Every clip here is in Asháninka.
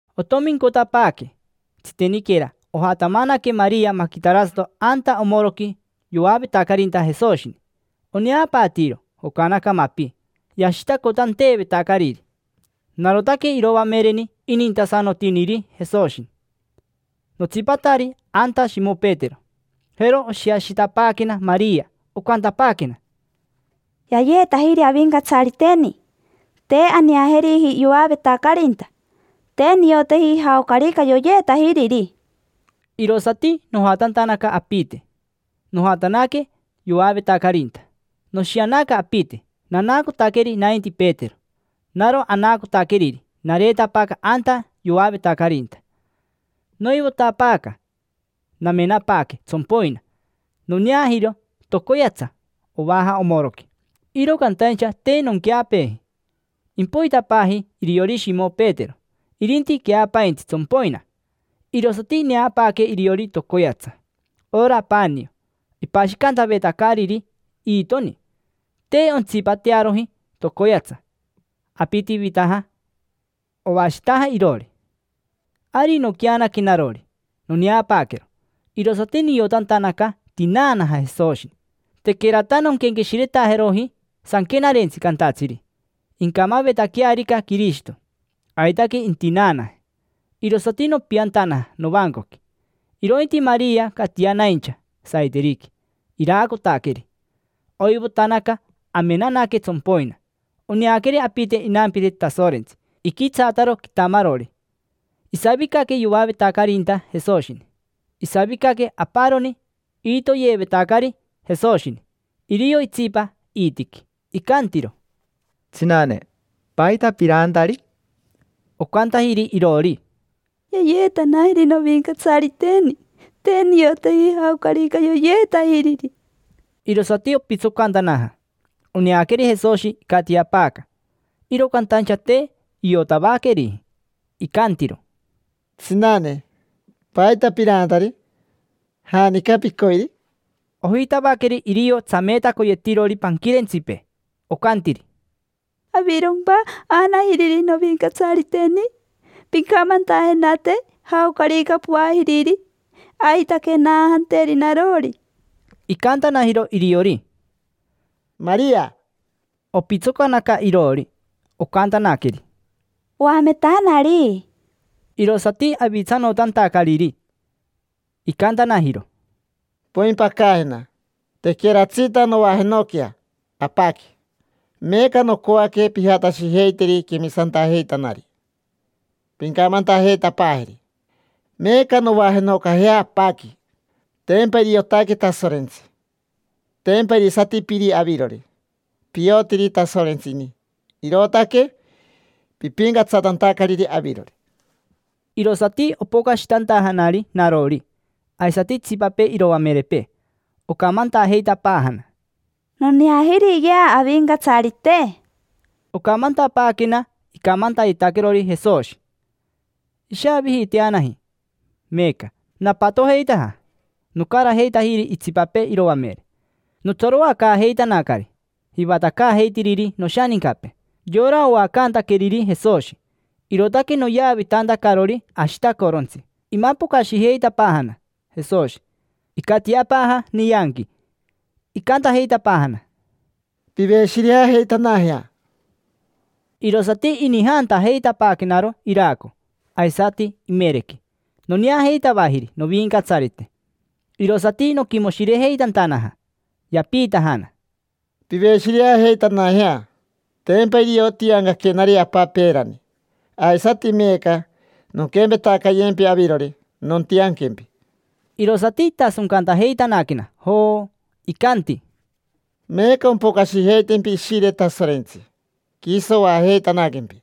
Otomincotapaaque. Tsiteniquera ojatamanaque Maria maquitarasato anta omoroqui yoavetacarinta Jesoshini. Oneapaatiiro jocanaja mapi yashitacotanteevetacariri. Narotaque iroamereni inintasanotiniri Jesoshi. Notsipatari anta Shimo Petero. Jero oshiashitapaaquena Maria. Ocantapaaquena: —Yayeetajiri Avincatsariteni. Te aneajeriji yoavetacarinta. Te nioteji jaocarica yoyeetajiriri. Irosati nojatantanaca apite. Nojatanaque yoavetacarinta. Noshianaca apite, nanaacotaqueri nainti Petero. Naro anaacotaqueriri nareetapaaca anta yoavetacarinta. Noivotapaaca, namenapaaque tsompoina. Noneajiro tocoyatsa ovaja omoroqui, iro cantaincha te nonqueapeeji. Impoitapaaji iriori Shimo Petero. Irinti queapaintsi tsompoina. Irosati ineapaaque iriori tocoyatsa. Ora panio ipashicanteevetacariri iitoqui, te ontsipatearoji tocoyatsa. Apitivitaja, ovashitaja iroori. Ari noqueanaque narori, noneapaaquero, irosati niotantanaca tinaanaja Jesoshi. Tequerata nonquenqueshiretajeroji Sanquenarentsi cantatsiri: “Incamavetaquearica Quirishito, aitaque intinaanaje”. Irosati nopiantanaja novancoqui. Irointi Maria catianaincha saiteriqui, iraacotaqueri. Oivotanaca, amenanaque tsompoina. Oneaqueri apite inampire Tasorentsi, iquitsaataro quitamarori. Isavicaque yoavetacarinta Jesoshini. Isavicaque aparoni iitoyeevetacari Jesoshini, irio itsipa iitiqui. Icantiro: —Tsinane, ¿paita piraantari? Ocantajiri iroori: —Yayeetanajiri novincatsariteni. Te nioteji jaocarica yoyeetajiriri. Irosati opitsocantanaja. Oneaqueri Jesoshi icatiapaaca, iro cantaincha te iotavaqueriji. Icantiro: —Tsinane, ¿paita piraantari? ¿Janica picoiri? Ojitavaqueri irio tsameetacoyetirori panquirentsipee. Ocantiri: —¿Avirompa aanajiriri novincatsariteni? Pincamantajenate jaocarica poajiriri. Aitaque naajanteri narori. Icantanajiro iriori: —Maria. Opitsocanaca iroori, ocantanaqueri: —Oametanari. Irosati avitsanotantacariri. Icantanajiro: —Poimpacajena: tequeratsita novajenoquea Apaqui. Meeca nocoaque pijatashijeiteri quemisantajeitanari, pincamantajeitapaajeri meeca novajenocajea Apaqui. Tempa iriotaque Tasorentsi. Tempa irisati Piri avirori, piotiri Tasorentsi ini, irootaque pipincatsatantacariri avirori. Irosati opocashitantajanari narori, aisati itsipapee iroamerepee, ocamantajeitapaajana: —Noneajiriyea Avincatsarite. Ocamantapaaquena icamantayetaquerori Jesoshi. Ishaavijiiteanaji meeca, napatojeitaja, nocarajeitajiri itsipapee iroamere. Notsaroacaajeitanacari jivatacaajeitiriri noshanincapee, yora oacantaqueriri Jesoshi, irootaque noyavitantacarori ashitacorontsi. Imapocashijeitapaajana Jesoshi, icatiapaaja nianqui. Icantajeitapaajana: —Piveshireajeitanajea. Irosati inijantajeitapaaquenaro iraco, aisati imerequi. Noneajeitavajiri Novincatsarite, irosati noquimoshirejeitantanaja. Yapiitajana: —Piveshireajeitanajea. Tempa irio tiancaquenari Apa peerani, aisati meeca nonquempetacayempi avirori, nontianquempi. Irosati itasoncantajeitanaquena, joo. Icanti: —Meeca ompocashijeitempi Ishire Tasorentsi, quiso oajeitanaquempi.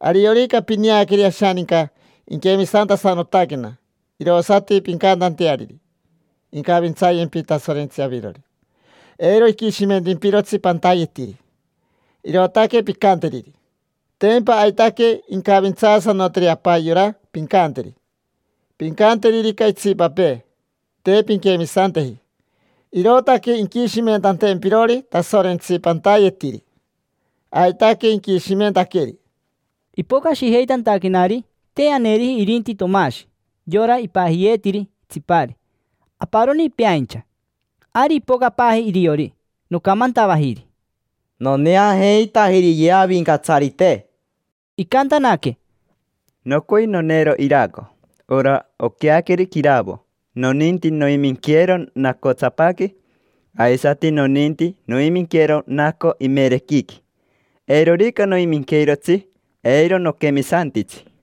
Ariorica pineaqueri ashaninca iquemisantasanotaquena, irosati pincantanteariri: “Incavintsayempi Tasorentsi avirori, eiro iquishimentimpirotsi pantayetiri”. Irootaque pincanteriri: tempa aitaque incavintsaasanoteri Apa yora pincanteri. Pincanteririca itsipapee: “Te pinquemisanteji, irootaque inquishimentantempirori Tasorentsi pantayetiri”, aitaque inquishimentaqueri. Ipocashijeitantaquenari, te aneriji irinti Tomashi, yora ipajiyeetiri Tsipari; aparoni peaincha. Ari ipocapaaji iriori, nocamantavajiri: —Noneajeitajiriyea Avincatsarite. Icantanaque: —Nocoi noneero iraco, ora oqueaqueri quiravo, noninti noiminqueero nacotsapaqui. Aisati noninti noiminqueero naco imerequiqui. Eirorica noiminqueirotsi, eiro noquemisantitsi.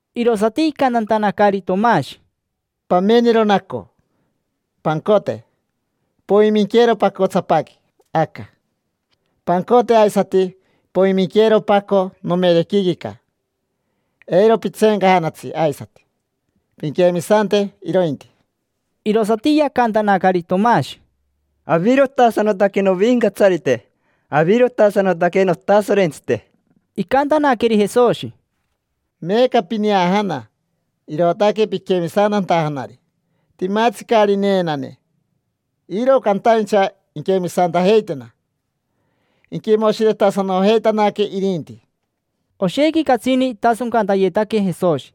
Irosati icantantanacari Tomashi: —Pamenero naco. Pancote, poiminqueero pacotsapaqui aca. Pancote aisati, poiminqueero paco nomerequiquica. Eiro pitseencajanatsi aisati, pinquemisante irointi. Irosati yacantanacari Tomashi: —Avirotasanotaque novincatsarite, avirotasanotaque notasorentsite. Icantanaqueri Jesoshi: —Meeca pineajana, irootaque piquemisantantajanari. Timatsi caari neenane, iro cantaincha inquemisantajeitena; inquimoshiretasanojeitanaque irinti. Oshequi catsini itasoncantayetaque Jesoshi.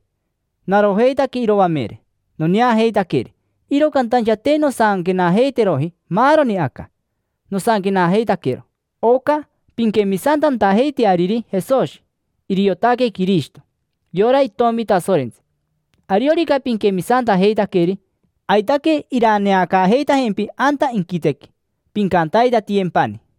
Narojeitaque iroamere, noneajeitaqueri, iro cantaincha te nosanquenajeiteroji maaroni aca. Nosanquenajeitaquero oca pinquemisantantajeiteariri Jesoshi iriotaque Quirishito, yora Itomi Tasorentsi. Ariorica pinquemisantajeitaqueri, aitaque iraneacaajeitajempi anta inquitequi, pincantaitatiyempani.